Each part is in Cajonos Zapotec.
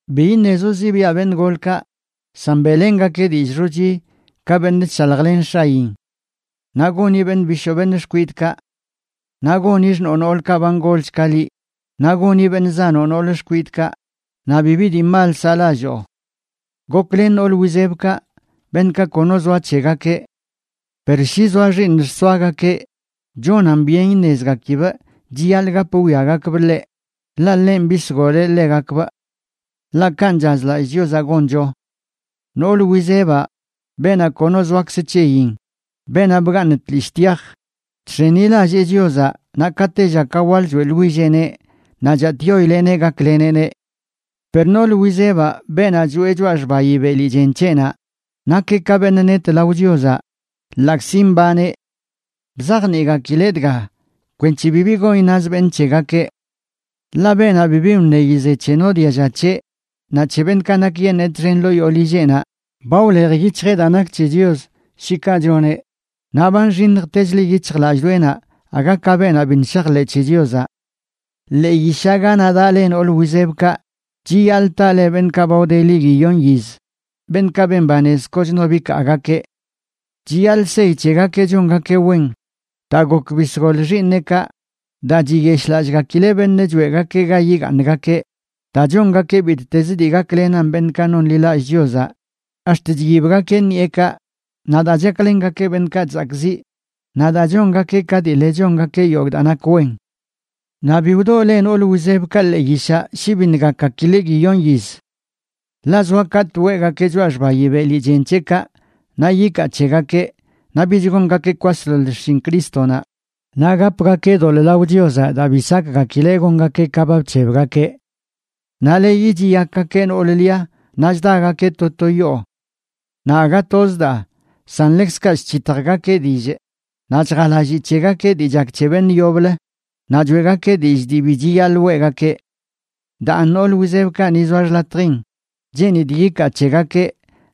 Bi iṉezoꞌ zibiaꞌ beṉꞌ golkaꞌ, san beꞌlengakeꞌ dillꞌ xochi ka beṉꞌ chshaljlen x̱ayin. Naꞌ goni beṉꞌ bishoo beṉꞌ xkwidꞌkaꞌ. Naꞌ goni xṉoo noolkaꞌ ba ngolch ka liꞌ, naꞌ goni beṉꞌ zanoꞌ nool xkwidꞌkaꞌ, naꞌ bibi dii mal saꞌlalloo. Goklen nool wizebkaꞌ, beṉꞌkaꞌ kono zoa c̱hegakeꞌ. Per shi zoa xiiṉ xsoagakeꞌ, chonan byen iṉezgakibꞌ chiyaḻꞌ gap wwiagakbꞌ ḻeꞌ, ḻaꞌ ḻenꞌ bisgoleꞌ ḻegakbꞌ. Ḻaꞌ kanꞌ chazlallꞌ Chiozaꞌ goncho. Nool wizebaꞌ, beenaꞌ kono zoakz c̱heyin, beenaꞌ bgaaṉ tlishꞌ tyaj, chx̱enilallee Chiozaꞌ naꞌ ka tella ka waḻ choeꞌḻwilleꞌneꞌ naꞌ chatꞌyoileꞌneꞌ gakleneꞌneꞌ. Per nool wizebaꞌ, beenaꞌ choeꞌ choꞌa xbayi beli chen c̱heꞌnaꞌ, nakeꞌ ka beṉꞌ net lao Chiozaꞌ ḻaꞌkzi mbaneꞌ. Bzajniꞌgakileꞌ dga kwenc̱he bibi gon iṉaz beṉꞌ c̱hegakeꞌ. Ḻaꞌ beenaꞌ bibi wṉeyi ze c̱he no dialla c̱heꞌ naꞌ c̱he beṉꞌkaꞌ nakyeṉee txen ḻoo yoo lilleꞌnaꞌ, ba wlej yic̱hjeꞌ daa nak c̱he Chios, shi kaꞌ choneꞌ, naꞌ ba nxiṉjtechlə yic̱hjlallꞌdoꞌenaꞌ aga ka beenaꞌ biṉꞌ shajḻeꞌ c̱he Chiozaꞌ. Ḻee yishaꞌ ganaꞌ daꞌ le nool wizebkaꞌ chiyaḻꞌ taꞌ le beṉꞌkaꞌ ba wdeli guiyon yiz, beṉꞌkaꞌ ben banez kochno bikaagakeꞌ. Chiyaḻꞌ seyi c̱hegakeꞌ chongakeꞌ wen: daa gok bisgol xiiṉeꞌkaꞌ, daa chiyeshꞌlallꞌgakileꞌ beṉꞌ choeꞌgakeꞌ ga yigaaṉgakeꞌ, daa chongakeꞌ bittez dii gaklenan beṉꞌkaꞌ nonḻilallꞌ Chiozaꞌ, ax̱t chyibgakeꞌ ṉiꞌekaꞌ, naꞌ daa chaklengakeꞌ beṉꞌkaꞌ chzakꞌziꞌ, naꞌ daa chongakeꞌ ka dii le chongakeꞌ yogꞌ daa nak wen. Naꞌ bi wdoo le nool wizebkaꞌ ḻee yishaꞌ shi biṉꞌ gakgakileꞌ guiyon yiz. Ḻaꞌ zoa katꞌ weꞌgakeꞌ choꞌa xbayi beli chen c̱heꞌkaꞌ naꞌ yikaa c̱hegakeꞌ naꞌ bich gongakeꞌ kwasḻoḻ xshin Crístonaꞌ, naꞌ gapgakeꞌ doḻꞌ lao Chiozaꞌ daa bi sakgakileꞌ gongakeꞌ ka ba bc̱hebgakeꞌ. Naꞌ leyi chiyakgakeꞌ noolə lia naꞌ chdagakeꞌ to to yoo. Naꞌ aga toz daa, san ḻekzkaꞌ chc̱hitjgakeꞌ dillꞌ, naꞌ chjalaalli c̱hegakeꞌ dii chak c̱he beṉꞌ yoblə, naꞌ choeꞌgakeꞌ dillꞌ dii bi chiyaḻꞌ weꞌgakeꞌ. Daan nool wizebkaꞌ ni zoa xḻatjin, cheenidꞌ yikaa c̱hegakeꞌ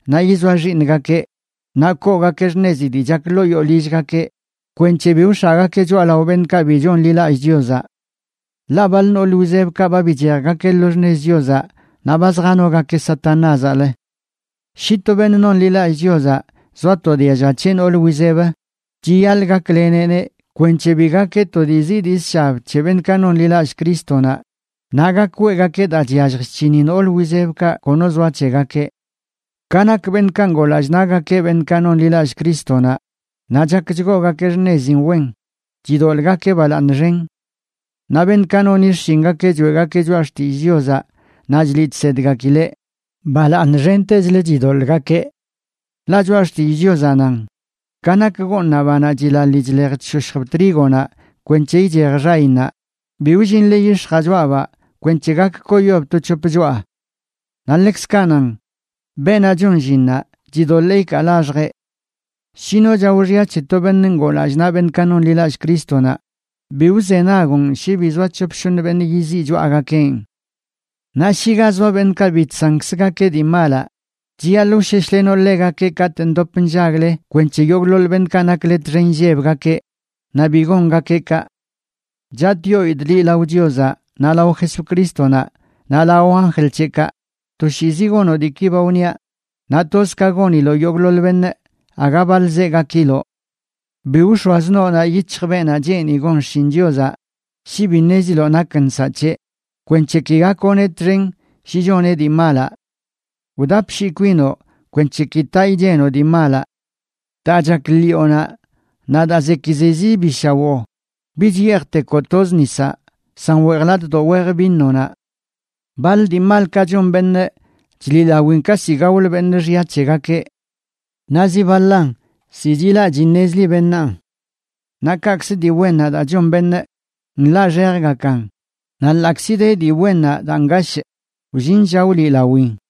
naꞌ yizoa xiiṉgakeꞌ, naꞌ koogakeꞌ xṉezi dii chak ḻoo yoo lillgakeꞌ, kwenc̱he bi wx̱aꞌgakeꞌ choꞌalao beṉꞌkaꞌ bi chonḻilallꞌ Chiozaꞌ. Ḻaꞌ baḻ nool wizebkaꞌ ba bichejgakeꞌ lo xṉez Chiozaꞌ naꞌ ba zjanogakeꞌ Satanázaꞌlə. Shi to beṉꞌ nonḻilallꞌ Chiozaꞌ zoa to dialla c̱heꞌ nool wizeb, chiyaḻꞌ gakleneꞌneꞌ kwenc̱he bi gakeꞌ to dii zii dii zshab c̱he beṉꞌkaꞌ nonḻilallꞌ Crístonaꞌ, naꞌ gak weꞌgakeꞌ daa chyallj chc̱hini nool wizebkaꞌ kono zoa c̱hegakeꞌ. Ka nak beṉꞌkaꞌ ngoo lallꞌ naꞌgakeꞌ beṉꞌkaꞌ nonḻilallꞌ Crístonaꞌ, naꞌ chak chgoogakeꞌ xṉezin wen, chidoḻꞌgakeꞌ balaaṉ xen. Naꞌ beṉꞌkaꞌ noni xshingakeꞌ choeꞌgakeꞌ choꞌa xtillꞌ Chiozaꞌ naꞌ chliꞌ chsedgakileꞌ, balaaṉ xentechlə chidoḻꞌgakeꞌ. Ḻaꞌ Choꞌa Xtillꞌ Chiozaꞌ nan: “Ka nak gooṉaꞌ banaꞌ chilaḻi chlej chshoshjb trígonaꞌ kwenc̱he ichej xayinnaꞌ, bi wllinle yix̱jaꞌ choꞌabaꞌ kwenc̱he gak koyob to c̱hop choꞌa.” Naꞌ ḻekzkaꞌ nan: “Beenaꞌ chon llinnaꞌ chidoḻee ikaa laxjeꞌ.” Shi no chao xya c̱he to beṉꞌ ngoo lallꞌ naꞌ beṉꞌkaꞌ nonḻilallꞌ Crístonaꞌ, bi wzenagoꞌn shi bi zoa c̱hop shoṉ beṉꞌ yiziꞌ choꞌagakeꞌn. Naꞌ shi ga zoa beṉꞌkaꞌ bi chsankzgakeꞌ dii malaꞌ, chiyaḻꞌ wsheshlenoꞌ ḻegakeꞌ katꞌ ndop nllagle kwenc̱he yogꞌḻoḻ beṉꞌkaꞌ nakle txen illebgakeꞌ naꞌ bi gongakeꞌ kaꞌ. Chatꞌyoidꞌ liꞌ lao Chiozaꞌ, naꞌ lao Jesucrístonaꞌ naꞌ lao anjl c̱heꞌkaꞌ, toshiizi gonoꞌ diiki ba wniaꞌ. Naꞌ toz ka goniloꞌ yogꞌḻoḻ beṉꞌ, aga baḻzeꞌ gakiloꞌ. Bi wx̱oazə noonaꞌ yic̱hj beenaꞌ cheeni gon xshin Chiozaꞌ shi bi ṉeziloꞌ nak nsaꞌ c̱heꞌ, kwenc̱he ki gakoꞌneꞌ txen shi choneꞌ dii malaꞌ. Wdapshii kwinoꞌ kwenc̱he ki taꞌ ichenoꞌ dii malaꞌ. Daa chak ḻiꞌonaꞌ naꞌ daa zekizezi bi shawoo, bich yeejtekoꞌ toz nisaꞌ, san weej latꞌdoꞌ wej vinonaꞌ. Baḻ dii malkaꞌ chon beṉꞌ chliꞌlawin ka ziꞌ gaolə beṉꞌ xya c̱hegakeꞌ. Naꞌ zi baḻan, ziꞌ chilaꞌ chiṉezli beṉaan. Naꞌ kaꞌkzə, dii wennaꞌ daa chon beṉꞌ nḻaꞌxejgakan, naꞌ ḻaꞌkzi de dii wennaꞌ daa ngashꞌ, wllin lla wliꞌlawin.